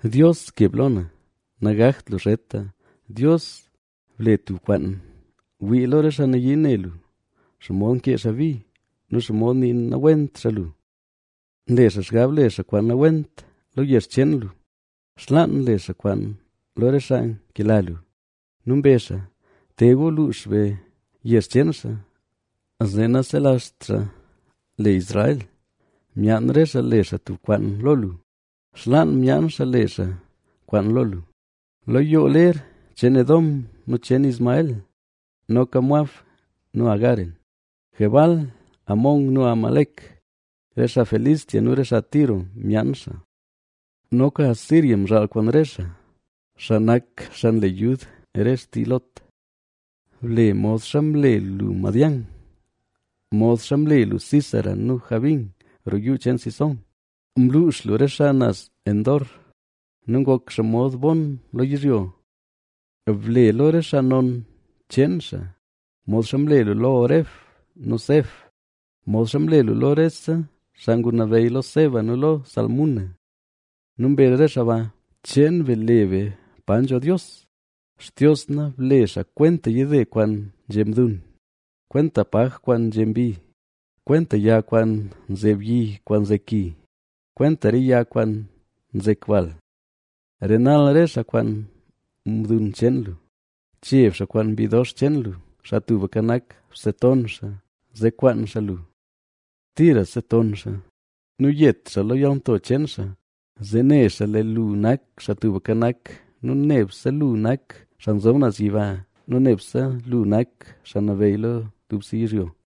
¡Dios, keb lo na! Nagakt lu zheta, Dios, ble tub kwaan. Wii lo re xaa nayii ne lu, xomod nkee xaa bi nu xomod nii nawent xaa lu. Nle xaa xgab le xaa kwaan nawent lo yezh cheen lu, xlaan nle xaa kwaan lo re xaa nkela lu. Nu mbezh xaa: “Te gu, luux be yezh cheen xaa zee naselazht xaa le Israel.” Myaan re xaa le xaa tub kwaan lo lu, xlaan myaan xaa le xaa kwaan lo lu, Lo yoo ler cheen Edom nu cheen Ismael, noka Moab nu Agaren, Gebal, Amón nu Amalec, re xaa Filistea nu re xaa Tiro myaan xaa. Noka Asiria mzhaal kwaan re xaa, xaa nak xaa nle yud re xtii Lot. Ble modxa mle lu Madián, modxa mle lu Sísara nu Jabín roo yuu cheen Cisón. Mluux lu re xaa naz Endor nu ngok xaa mod bon lo yizhyo. Ble lo re xaa non cheen xaa modxa mle lu lo Oreb nu Zeeb; modxa mle lu lo rese xaa ngunabeyy lo Zeba nu lo Zalmuna. Nu mbezh re xaa ba: “¡Cheen be le be pa nzho Dios!” Xtios na, ble xaa kwenta yide kwaan nzhe mdun, kwenta paj kwaan nzhe mbi, kwenta yag kwaan nzeb yi kwaan nzek ki, kwenta re yag kwaan nzek bal. Renal re xaa kwaan mdun cheen lu, cheb xaa kwaan mbi dox cheen lu. Xaa Tubka Nak, bseton xaa, zee kwaan xaa lu. Tira seton xaa nu yet xaa lo yalnto cheen xaa, Zee ne xaa lee lu nak Xaa Tubka Nak nu nebse lu nak Xaa Nzob Naz Yiba nu nebse lu nak xaa nabeyy lo dubse yizhyo.